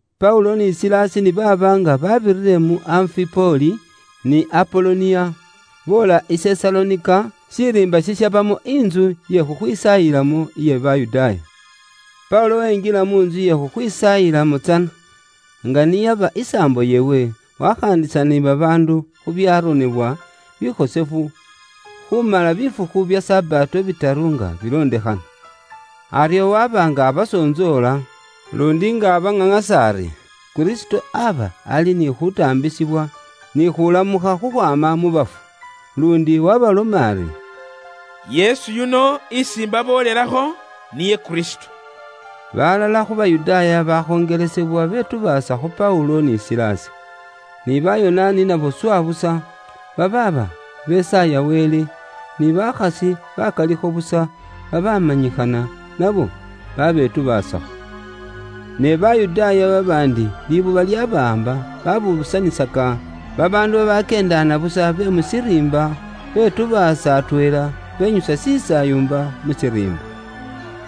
Paulo ni Silasi ni baaba nga babirire mu Anfipoli ni Apoloniya, boola i Sesalonika, shiriimba shishabamo intsu iye khukhwisaayilamo iye Bayudaaya. Paulo wenjila mu ntsu iye khukhwisaayilamo tsana, nga niyaba isaambo yeewe, wakhaandisana ni babaandu khu byaronebwa bikhosefu, khumala bifukhu bya Sabato bitaru nga bilondekhana. Aryo waba nga abasontsoola, luundi nga abaŋaŋasa ari Kristo aba ali ni khutaambisibwa, ni khulamukha khukhwaama mu bafu. Luundi waabaloma ari, “Yesu yuno isi imbaboolelakho niye Kristo.” Balala khu Bayudaaya bakhonjelesebwa betubaasa khu Paulo ni Silasi. Ni Bayonaani nabo swa busa, babaaba besaaya Wele, ni bakhasi bakalikho busa babaamanyikhana nabo babetubaasakho. Ne Bayudaaya babaandi libuba lyabawaamba, babuusanisaka babaandu babakyeendaana busa be mu shiriimba, betubaasa atweela, benyusa shisaayumba mu shiriimba.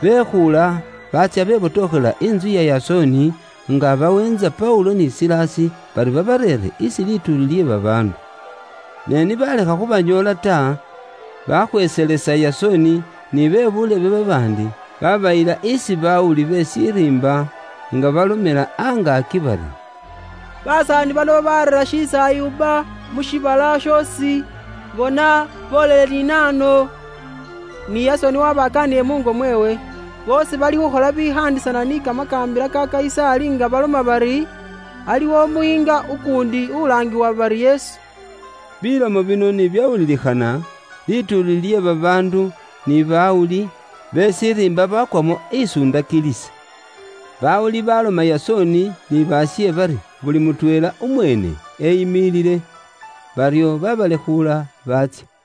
Bekhuula, baatsya bebotokhelela intsu ya Yasoni, nga baweentsa Paulo ni Silasi, bari babareere isi lituuli lye babaandu. Ne ni balekha khubanyoola ta, bakhweeselesa Yasoni ni be buulebe babaandi, babayila isi bawuli be shiriimba, nga balomela angaaki bari, “Basaani bano babareera shisaayumba mu shiibala shoosi, bona, boolele ni nahano, ni Yasoni wabakaanile muungo mweewe. Boosi balikhukhola bibikhaandisana ni kamakaambila ka Kayisaali nga baloma bari, ‘Aliwo Umuyiinga ukuundi ulaangiwa bari Yesu.’” Bilomo bino ni byawulilikhana, lituuli lye babaandu ni bawuli be shiriimba bakwamo isundakilisi. Bawuli baloma Yasoni ni baashe bari buli mutweela umweene eyimilile. Baryo babalekhuula baatsya.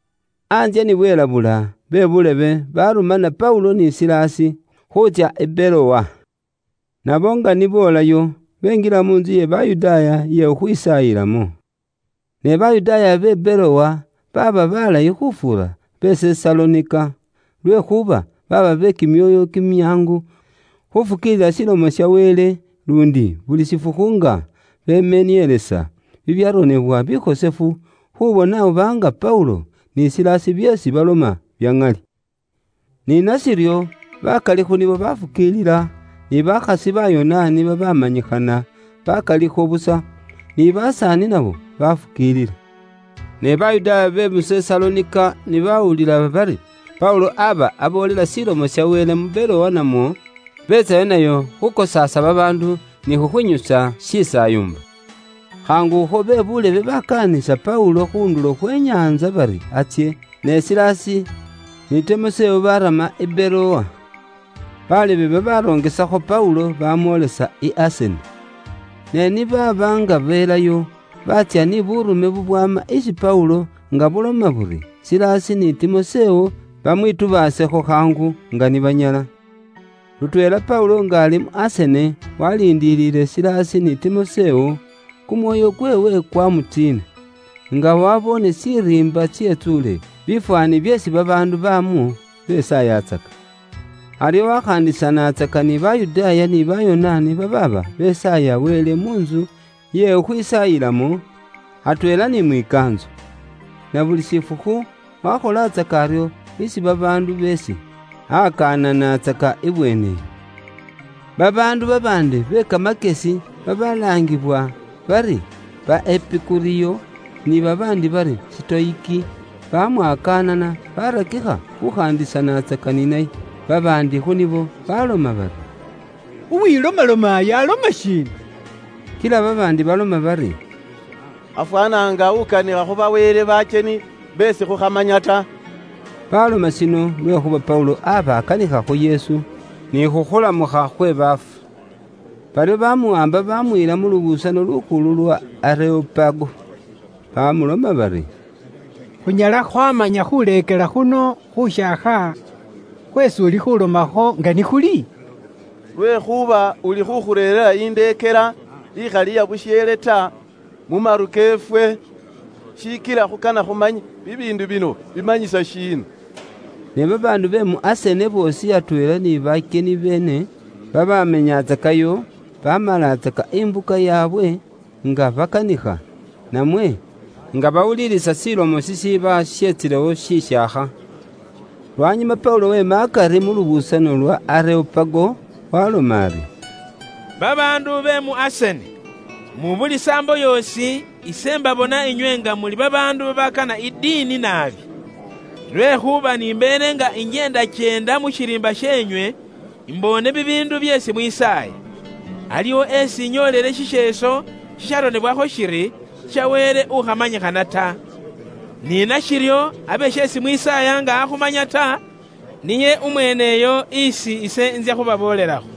Antsye ni bwelabula, be buulebe baarumana Paulo ni Silasi khuutsya i Berowa. Nabo nga ni boolayo, benjila mu ntsu iye Bayudaaya iye khukhwisaayilamo. Ne Bayudaaya be Berowa baaba balayi khufuura be Sesalonika, lwekhuuba baaba be kimyoyo kimyaangu khufukiilila Ilomo ya Wele, luundi buli shifukhu nga bemenielesa bibyaronebwa bikhosefu, khuubona oba nga Paulo ni Silasi byeesi baloma bya ŋali. Ni nashiryo, bakali khu nibo baafukiilila, ni bakhasi Bayonaani babaamanyikhana bakalikho busa, ni basaani nabo bafukiilila. Ne Bayudaaya be mu Sesalonika ni baawulila bari Paulo aaba aboolela Ilomo ya Wele mu Berowa namwo, beetsayo nayo khuukosaasa babaandu ni khukhwinyusa shisaayumba. Khaangukho be buulebe bakaanisa Paulo khu ndulo khwe nyaantsa bari atsye, ne Silasi ni Timosewo baarama i Berowa. Balebe babaarongesakho Paulo, baamwoolisa i Asene. Ne ni baaba nga beelayo, baatsya ni buurume bubwaama isi Paulo nga buloma buri Silasi ni Timosewo bamwitubaasekho khaangu nga ni banyala. Lutweela Paulo nga ali mu Asene, waaliindile Silasi ni Timosewo, kumwoyo kweewe kwaamutsiina, nga waaboone shiriimba shetsuule bifwaani byeesi babaandu baamwo besaayatsaka. Aryo wakhaandisanaatsaka ni Bayudaaya ni Bayonaani babaaba besaaya Wele mu ntsu iye khukhwisaayilamo, atweela ni mwikaantso. Na buli shifukhu wakholatsaka aryo isi babaandu beesi akananatsaka ibweeneyo. Babaandu babaandi be kamakyesi babalaangiwa bari ba Epikuriyo ni babaandi ba Sitoyiki, bamwakaanana baarakikha khukhaandisanatsaka ni naye. Babaandi khu nibo baloma bari, “Uwilomalomayu aloma shiina?” Kila babaandi baloma bari, “Afwaana nga ukanikha khu ba wele banaambo beesi ifwe khukhamanya ta.” Baaloma shino lwekhuuba Paulo aaba akanikha khu Yesu, ni khu khuulamukha khwe baafu. Baryo baamuwaamba baamuyila mu lubuusano lukhulu lwa Areopago, baamuloma bari, “Khunyala khwaamanya khuuleekela khuno khushaakha khweesi uli khuulomakho nga ni khuli? Lwekhuuba ulikhuukhureerera indeekela ikhali iya busheele ta mu maru keefwe. Shikila khukana khumanye, bibiindu bino bimanyisa shiina?” Ne babaandu be mu Asene boosi atweela ni bakyeni beene babaamenyatsakayo, baamalatsaka imbuka yaabwe nga bakanikha, namwe nga bawuliilisa shilomo shishiiba sheetsilewo shishaakha. Lwanyuma Paulo weema akari mu lubuusano lwa Areopago, waaloma ari, “Babaandu be mu Asene, mu buli saambo yoosi, ise mbabona inywe nga muli babaandu babaakana i diini naabi. Lwekhuuba ni mbeele nga injeendakyeenda mu shiriimba sheenywe, imboone bibiindu byeesi mwisaaya. Aliwo isi inyoolele shisheeso shisharonebwakho shiri, ‘Sha wele ukhamanyikhana ta.’ Ni nashiryo, abe sheesi mwisaaya nga akhumanya ta, niye umweeneyo isi ise intsya khubaboolelakho.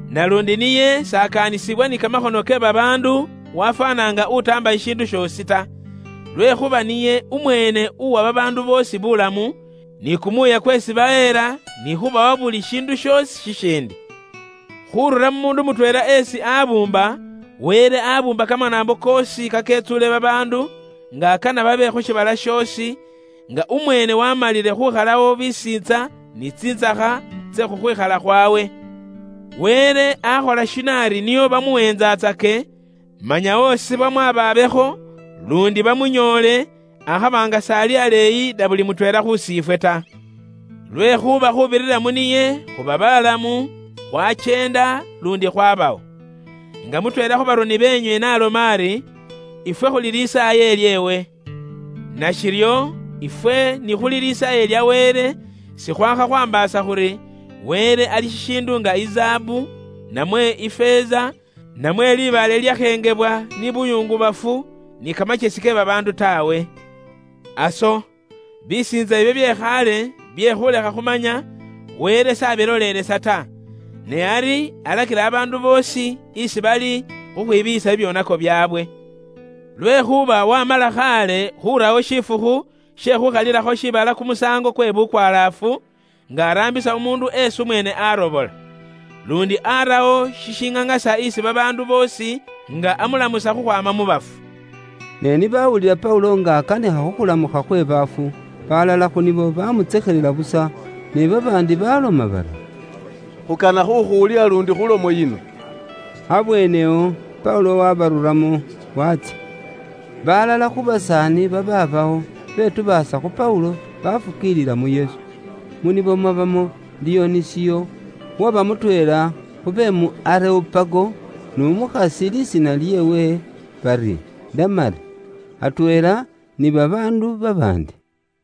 Naluundi niye s'ekoomba babaandu khumuwa bibiindu, wafwaana nga utaamba shishiindu shoosi ta. Lwekhuuba niye umweene uwa babaandu boosi bulamu, ni kumuuya kweesi baheela, ni khubawa buli shiindu shoosi shishiindi. Khurura mu muundu mutweela esi abuumba, Wele abuumba kamanaambo koosi kaketsuule babaandu, nga akana babe khu shiibala shoosi, nga umweene waamalile khukhalawo bisiintsa ni tsintsakha tse khukhwikhala khwawe. “Wele akhola shino ari nio bamuweentsatsake, manya osi bamwababekho, luundi bamunyoole, akhaba nga s'ali aleeyi na buli mutweela khusiifwe ta. Lwekhuuba khuubirira mu niye khuba balamu, khwakyeenda, luundi khwabawo. Nga mutweela khu baroni beenywe n'aloma ari, ‘Ifwe khuli lisaaye lyeewe.’ “Nashiryo, ifwe ni khuli lisaaye lya Wele sikhwaakha khwaambaasa khuri Wele ali shishiindu nga izaabu, namwe ifeeza, namwe libaale lilyakhengebwa ni buyungubafu, ni kamakyesi ke babaandu taawe. Aso, bisiintsa ibyo bye khaale, bye khuulekha khumanya, Wele s'abilolelesa ta, ne ari alakila babaandu boosi isi bali khukhwibiiyisa bibyoonako byaabwe. Lwekhuuba waamala khaale khuurawo shifukhu she khuukhalilakho shiibala kumusaango kwe bukwalaafu, nga araambisa umuundu eesi umweene aarobola. Luundi aarawo shishiŋaŋasa isi babaandu boosi nga amulamusa khukhwaama mu bafu.” Ne ni baawulila Paulo nga akanikha khu khulamukha khwe baafu, baalala khu nibo baamutsekhelela busa, ne babaandi baaloma bari, “Khukana khukhuwulila luundi khu lomo yino.” Abweenewo, Paulo wabaruramo, watsya. Balala khu basaani babaabawo betubaasa khu Paulo, bafukiilila mu Yesu. Mu nibo mwabamo Diyonisiyo, uwaba mutweela khu be mu Areopago, n'umukhasi lisiina lyeewe bari Damari, atweela ni babaandu babaandi.